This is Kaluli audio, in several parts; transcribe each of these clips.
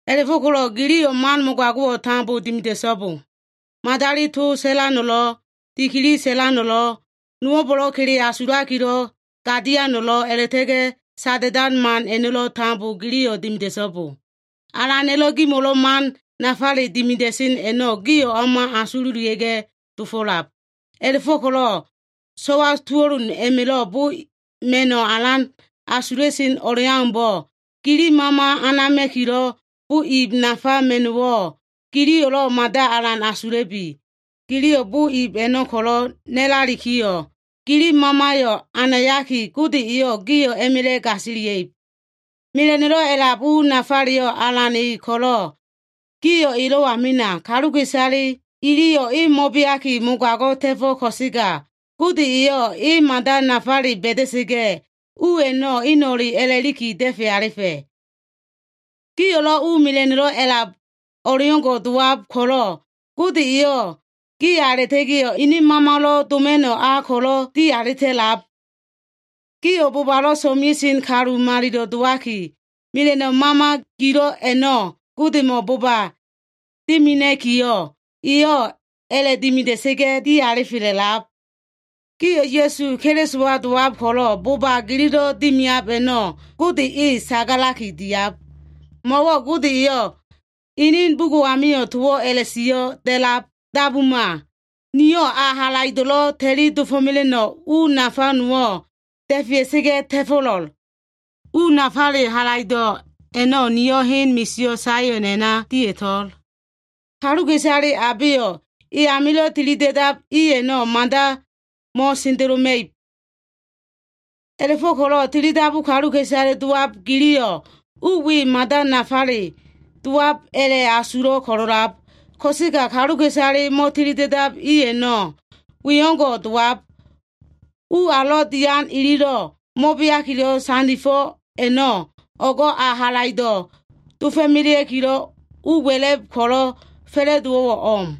A꞉la꞉fo꞉ko꞉lo꞉ giliyo꞉ man mogago꞉wo꞉ tambo dimida꞉so꞉bo. Madali to sa꞉lano꞉lo꞉, dikili sa꞉lano꞉lo꞉, nowo꞉mbo꞉lo꞉ kele asulakilo꞉ gadiano꞉lo꞉, a꞉la꞉ta꞉ga꞉ sada꞉dan man a꞉no꞉lo꞉ tambo giliyo꞉ dimida꞉so꞉bo. Alana꞉lo꞉ gimo꞉lo꞉ man nafale dimida꞉sen a꞉no꞉ gio꞉ o꞉ma asululia꞉ga꞉ dofo꞉lab. A꞉la꞉fo꞉ko꞉lo꞉ so꞉wa tuo꞉lun a꞉ma꞉lo꞉ bo ma꞉no꞉ alan asula꞉sen o꞉leaumbo꞉, gili mama anama꞉kilo꞉ bo ib nafa ma꞉no꞉wo꞉ giliyo꞉lo꞉ mada alan asula꞉bi. Giliyo꞉ bo ib a꞉no꞉ ko꞉lo꞉ na꞉lalikiyo꞉, gili mamayo꞉ anayaliki, Gode eyo꞉ gio꞉ a꞉ma꞉la꞉ gasilia꞉ib. Mela꞉no꞉lo꞉ a꞉lab u nafaleyo꞉ Alan e ko꞉lo꞉, gio꞉ elo꞉wa mena. Kaluka꞉isale iliyo꞉ e mo꞉beaki mogago꞉ ta꞉fo꞉ ko꞉sega, Gode eyo꞉ e mada nafale ba꞉da꞉sa꞉ga꞉, u a꞉no꞉ eno꞉le a꞉lakiyo꞉ da꞉fe alifa꞉. Gio꞉lo꞉ u mela꞉no꞉lo꞉ a꞉lab o꞉leo꞉ngo꞉ dowab ko꞉lo꞉, Gode eyo꞉ giya a꞉la꞉ta꞉ga꞉yo꞉ ene Mamalo꞉ doma꞉no꞉ a ko꞉lo꞉ di alita꞉lab. Gio꞉ bobalo꞉ so꞉mea꞉sen kalu malilo꞉ dowakiyo꞉, mela꞉no꞉ mama gilo꞉ a꞉no꞉ Godemo꞉ boba dimina꞉kiyo꞉, eyo꞉ a꞉la꞉dimida꞉sa꞉ga꞉ dialifa꞉la꞉lab. Gio꞉ Ya꞉su Kelisowa dowab ko꞉lo꞉, bo꞉ba gililo꞉ dimiab a꞉no꞉ Gode e sagalaki diab. Mo꞉wo꞉ Gode eyo꞉ ene bugo꞉ amio꞉ towo꞉ a꞉la꞉sio꞉ da꞉lab, “Dabuma! Niyo꞉ a halaido꞉lo꞉ ta꞉li dofo꞉mela꞉no꞉ u nafa nowo꞉ da꞉fea꞉sa꞉ga꞉ ta꞉fo꞉lo꞉l. U nafale halaido꞉ a꞉no꞉ niyo꞉ hen misio꞉ Saion a꞉na dia꞉to꞉l. Kaluka꞉isale abeyo꞉ e amilo꞉ tilida꞉dab i a꞉no꞉ mada mo꞉sendeloma꞉ib.” A꞉la꞉fo꞉ko꞉lo꞉ tilidabu kaluka꞉isale dowab giliyo꞉ u we mada nafale dowab a꞉la꞉asulo꞉ ko꞉lo꞉lab. Ko꞉sega kaluka꞉isale mo꞉tilida꞉dab i a꞉no꞉ we o꞉ngo꞉ dowab, “ U alo꞉ dian ililo꞉ mo꞉beakilo꞉ sandifo꞉ a꞉no꞉, o꞉go꞉ ayo꞉ halaido꞉ dofo꞉melea꞉kilo꞉ u wa꞉la꞉b ko꞉lo꞉ fa꞉la꞉dowo꞉wo꞉ o꞉m.”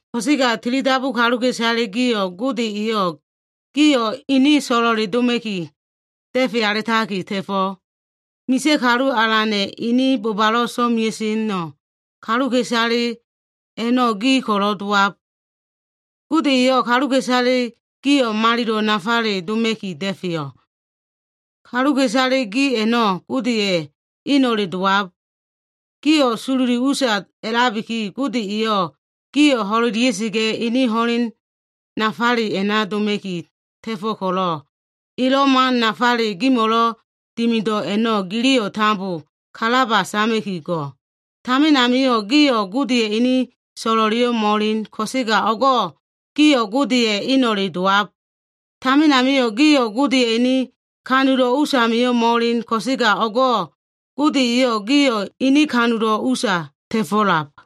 Ko꞉sega tilidabu kaluka꞉isale gio꞉, Gode eyo꞉ gio꞉ ene so꞉lo꞉le doma꞉ki da꞉fe alitaki ta꞉fo꞉. Misa꞉ Kalu Alana꞉ ene bobalo꞉ so꞉mea꞉no꞉ kaluka꞉isale a꞉no꞉ gi ko꞉lo꞉ dowab. Gode eyo꞉ kaluka꞉isale gio꞉ malilo꞉ nafale doma꞉ki da꞉feyo꞉. Kaluka꞉isale gi a꞉no꞉ Godeya꞉ eno꞉le dowab. Gio꞉ sololi usa a꞉labiki, Gode eyo꞉ gio꞉ ho꞉lelia꞉sa꞉ga꞉ ene ho꞉len nafale a꞉na doma꞉ki ta꞉fo꞉ ko꞉lo꞉, elo꞉ man nafale gimo꞉lo꞉ dimido꞉ a꞉no꞉ giliyo꞉ tambo kalaba sama꞉ki go꞉. Tamin amio꞉ gio꞉ Godeya꞉ ene so꞉lo꞉leyo꞉ mo꞉elen. Ko꞉sega o꞉go꞉ gio꞉ Godeya꞉ eno꞉le dowab. Tamin amio꞉ gio꞉ Godeya꞉ ene kanulo꞉ usamio꞉ mo꞉elen ko꞉sega, o꞉go꞉ Gode eyo꞉ gio꞉ ene kanulo꞉ usa ta꞉fo꞉lab.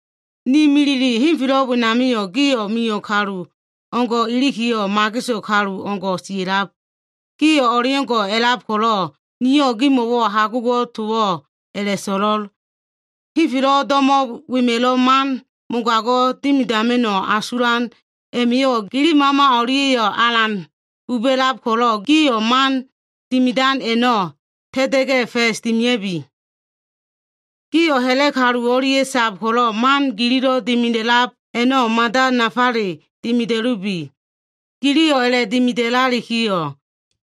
Ne milile, henfelo꞉ wenamio꞉ gio꞉ mio꞉ kalu o꞉ngo꞉ ilikiyo꞉, mageso꞉ kalu o꞉ngo꞉ sia꞉lab. Gio꞉ o꞉leo꞉ngo꞉ a꞉lab ko꞉lo꞉ niyo꞉ gimo꞉wo꞉ hagugo꞉ towo꞉ a꞉la꞉so꞉lo꞉l. Henfelo꞉ do꞉mo꞉ wema꞉lo꞉ man mogago꞉ dimidama꞉no꞉ asulan a꞉ma꞉yo꞉ gili mama o꞉lia꞉yo꞉ alan buba꞉lab ko꞉lo꞉, gio꞉ man dimidan a꞉no꞉ ta꞉ta꞉ga꞉ fa꞉s dimia꞉bi. Gio꞉ ha꞉la꞉ kalu o꞉lia꞉ sab ko꞉lo꞉, man gililo꞉ dimida꞉lab a꞉no꞉ mada nafale dimida꞉lubi. Giliyo꞉ a꞉la꞉dimidalikiyo꞉,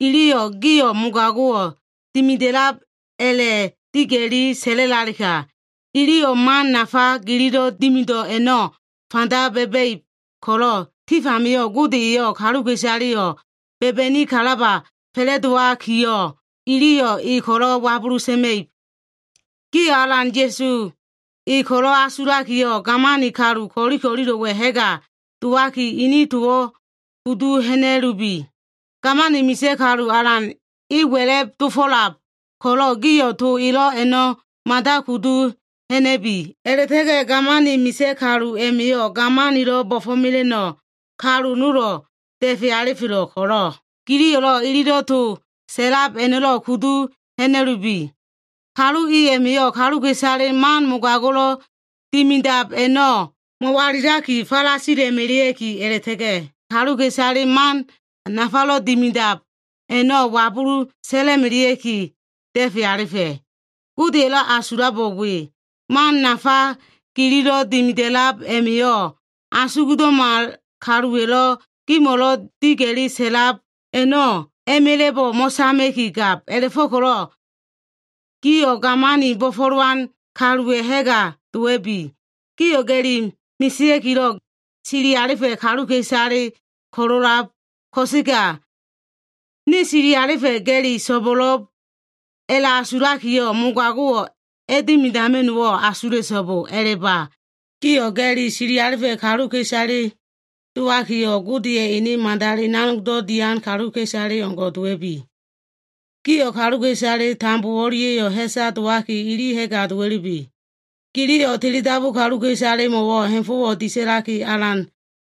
iliyo꞉ gio꞉ mogago꞉wo꞉ dimidab a꞉la꞉diga꞉li sa꞉lalega, iyo꞉ man nafa gililo꞉ dimido꞉ a꞉no꞉ fanda ba꞉ba꞉ib ko꞉lo꞉, tif amio꞉ Gode eyo꞉ kaluka꞉isaleyo꞉ ba꞉ba꞉ni kalaba fa꞉la꞉dowalikiyo꞉, iliyo꞉ e ko꞉lo꞉ wabulu sa꞉ma꞉ib. Gio꞉ Alan Ya꞉su e ko꞉lo꞉ asulakiyo꞉, gamani kalu ko꞉li ko꞉lilo꞉wa꞉ ha꞉ga dowaki, ini towo꞉ kudu ha꞉na꞉lubi. Gamani misa꞉ kalu alan e wa꞉la꞉b dofo꞉lab ko꞉lo꞉, gio꞉ to elo꞉ a꞉no꞉ mada kudu ha꞉na꞉bi. A꞉la꞉ta꞉ga꞉ gamani misa꞉ kalu a꞉ma꞉yo꞉ gamanilo꞉ bo꞉fo꞉mela꞉no꞉ kalu nolo꞉ da꞉fe alifelo꞉ ko꞉lo꞉, giliyo꞉ ililo꞉ to sa꞉lab a꞉no꞉lo꞉ kudu ha꞉na꞉lubi. Kalu i a꞉ma꞉yo꞉, kaluka꞉isale man mogago꞉lo꞉ dimidab a꞉no꞉ mo꞉walilaki falasila꞉melea꞉ki, a꞉la꞉ta꞉ga꞉ kaluka꞉isale man nafalo꞉ dimidab a꞉no꞉ wabulu sa꞉la꞉melea꞉ki da꞉fe alifa꞉. Godeya꞉lo꞉ asulabo꞉ we. Man nafa gililo꞉ dimida꞉lab a꞉ma꞉yo꞉, asugdo꞉ma kaluwa꞉lo꞉ gimo꞉lo꞉ diga꞉li sa꞉lab a꞉no꞉ a꞉ma꞉la꞉bo꞉ mo꞉sama꞉ki gab. A꞉la꞉fo꞉ko꞉lo꞉ gio꞉ gamani bo꞉fo꞉lowan kaluwa꞉ ha꞉ga dowa꞉bi. Gio꞉ ga꞉li mesea꞉kilo꞉ sili alifa꞉ kaluka꞉isale ko꞉lo꞉lab ko꞉sega, “Ne sili alifa꞉ ga꞉li so꞉bo꞉lo꞉b” a꞉la꞉asulakiyo꞉, mogago꞉ a꞉dimidama꞉no꞉wo꞉ asula꞉so꞉bo. A꞉la꞉ba. Gio꞉ ga꞉li sili alifa꞉ kaluka꞉isale dowakiyo꞉, gio꞉ Godeya꞉ ene madali nanogdo꞉ dian kaluka꞉isale o꞉ngo꞉ dowa꞉bi. Gio꞉ kaluka꞉isale tambo o꞉lia꞉yo꞉ ha꞉sa dowaki, ili ha꞉ga dowa꞉lubi. Giliyo꞉ tilidabu kaluka꞉isalemo꞉wo꞉ ha꞉fo꞉wo꞉ disa꞉laki, alan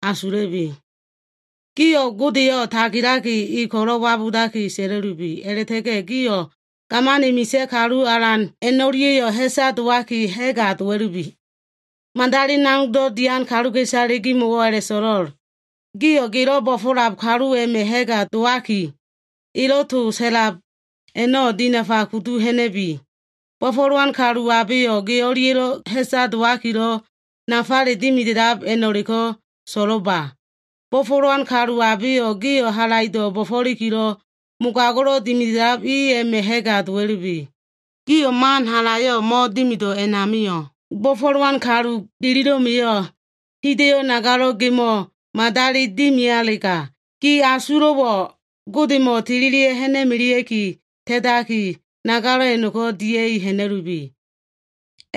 asula꞉bi. Gio꞉ Godeyo꞉ tagilaki, e ko꞉lo꞉ wabudaki sa꞉la꞉lubi. A꞉la꞉ta꞉ga꞉ gio꞉ gamani misa꞉ kalu alan a꞉no꞉lia꞉yo꞉ ha꞉sa dowaki ha꞉ga dowa꞉lubi. Madali nanogdo꞉ dian kaluka꞉isale gimo꞉wo꞉ a꞉la꞉so꞉lo꞉l. Gio꞉ gelo꞉ bo꞉fo꞉lab kalu a꞉ma꞉ ha꞉ga dowaki, elo꞉ to sa꞉lab a꞉no꞉ dinafa kudu ha꞉na꞉bi. Bo꞉fo꞉lab kalu abeyo꞉ gi o꞉lia꞉lo꞉ ha꞉sa dowakilo꞉, nafale dimidab a꞉no꞉leko꞉ so꞉lo꞉lba. Bo꞉fo꞉lab kalu abeyo꞉ gio꞉ halaido꞉ bo꞉fo꞉likilo꞉ mogago꞉lo꞉ dimida꞉lab i a꞉ma꞉ ha꞉ga dowa꞉lubi. Giyo꞉ man halayo꞉ mo꞉dimido꞉ a꞉namio꞉, bo꞉fo꞉lowan kalu gilo꞉ma꞉yo꞉ hida꞉yo꞉ nagalo꞉wo꞉ gemo꞉ madali dimialega, gi asulo꞉wo꞉ Godemo꞉ tililia꞉ ha꞉na꞉melea꞉ki ta꞉taki, nagalo꞉ a꞉no꞉ dia꞉i ha꞉na꞉lubi.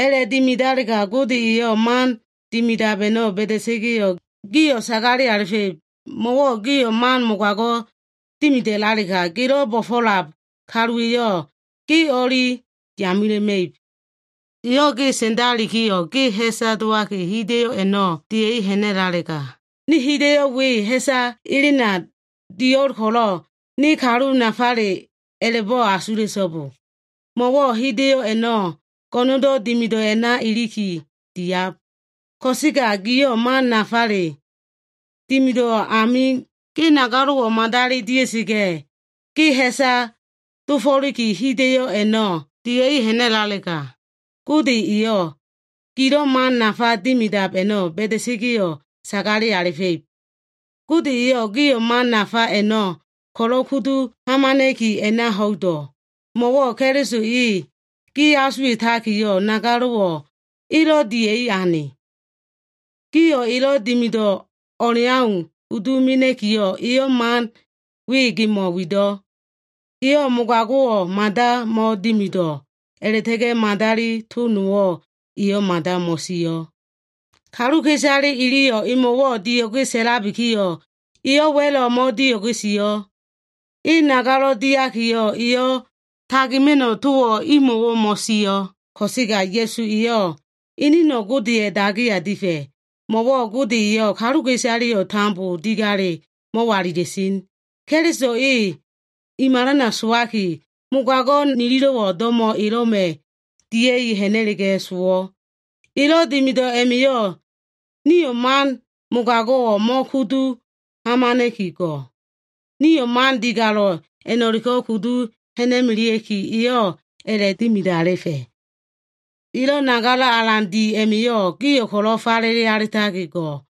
A꞉la꞉dimidalega Gode eyo꞉ man dimidab a꞉no꞉ ba꞉da꞉sa꞉ga꞉yo꞉, gio꞉ sagale alifa꞉ib. Mo꞉wo꞉ giyo꞉ man mogago꞉wo꞉ dimidalega, gelo꞉ bo꞉fo꞉lab kaluwa꞉yo꞉ ge o꞉li yamela꞉ma꞉ib. Eyo꞉ ge sa꞉ndalikiyo꞉ ge ha꞉sa dowaki, hida꞉yo꞉ a꞉no꞉ dia꞉i ha꞉na꞉lalega, “Ne hida꞉yo꞉ we ha꞉sa elena dio꞉l ko꞉lo꞉ ne kalu nafale,” a꞉la꞉bo꞉ asula꞉so꞉bo. Mo꞉wo꞉ hida꞉yo꞉ a꞉no꞉ go꞉no꞉ndo꞉ dimido꞉ a꞉na iliki diab. Ko꞉sega giyo꞉ man nafale dimido꞉ amio꞉, ge nagalo꞉wo꞉ madali dia꞉sa꞉ga꞉ ge ha꞉sa dofo꞉liki hida꞉yo꞉ a꞉no꞉ dia꞉i ha꞉na꞉lalega, Gode eyo꞉ gilo꞉ man nafa dimidab a꞉no꞉ ba꞉da꞉sa꞉ga꞉yo꞉ sagale alifa꞉ib. Gode eyo꞉ gio꞉ man nafa a꞉no꞉ ko꞉lo꞉ kudu hamana꞉ki a꞉na ho꞉ido꞉. Mo꞉wo꞉ Keliso e gi asuwa꞉takiyo꞉, nagalo꞉wo꞉ e dia꞉i ane. Gio꞉ elo꞉ dimido꞉ o꞉leau kudu mena꞉kiyo꞉, eyo꞉ man we gimo꞉wo꞉ a꞉na wido꞉. “Eyo꞉ mogago꞉wo꞉ mada mo꞉dimido꞉, a꞉la꞉ta꞉ga꞉ madali to nowo꞉ eyo꞉ mada mo꞉sio꞉.” Kaluka꞉isale iliyo꞉ emo꞉wo꞉ dio꞉ge sa꞉labikiyo꞉, eyo꞉ wa꞉lo꞉ mo꞉dio꞉ge sio꞉. E nagalo꞉ diakiyo꞉, eyo꞉ tagima꞉no꞉ towo꞉ imo꞉wo꞉ mo꞉sio꞉. Ko꞉sega Ya꞉su eyo꞉ eneno꞉ Godeya꞉ dagiya difa꞉. Mo꞉wo꞉ Gode eyo꞉ kaluka꞉isaleyo꞉ tambo digale mo꞉walila꞉sen. Keliso e i malana sowaki, mogago꞉ nililo꞉wo꞉ do꞉mo꞉ elo꞉ma꞉ dia꞉i ha꞉na꞉la꞉ga꞉ sowo꞉. Elo꞉ dimido꞉ a꞉ma꞉yo꞉, nio꞉ man mogago꞉wo꞉ mo꞉kudu hamana꞉ki go꞉. Nio꞉ man digalo꞉ a꞉no꞉leko꞉ kudu ha꞉na꞉melea꞉ki, eyo꞉ a꞉la꞉dimidalifa꞉. Elo꞉ nagalo꞉ alan di a꞉ma꞉yo꞉ gio꞉ ko꞉lo꞉ falele alitaki go꞉.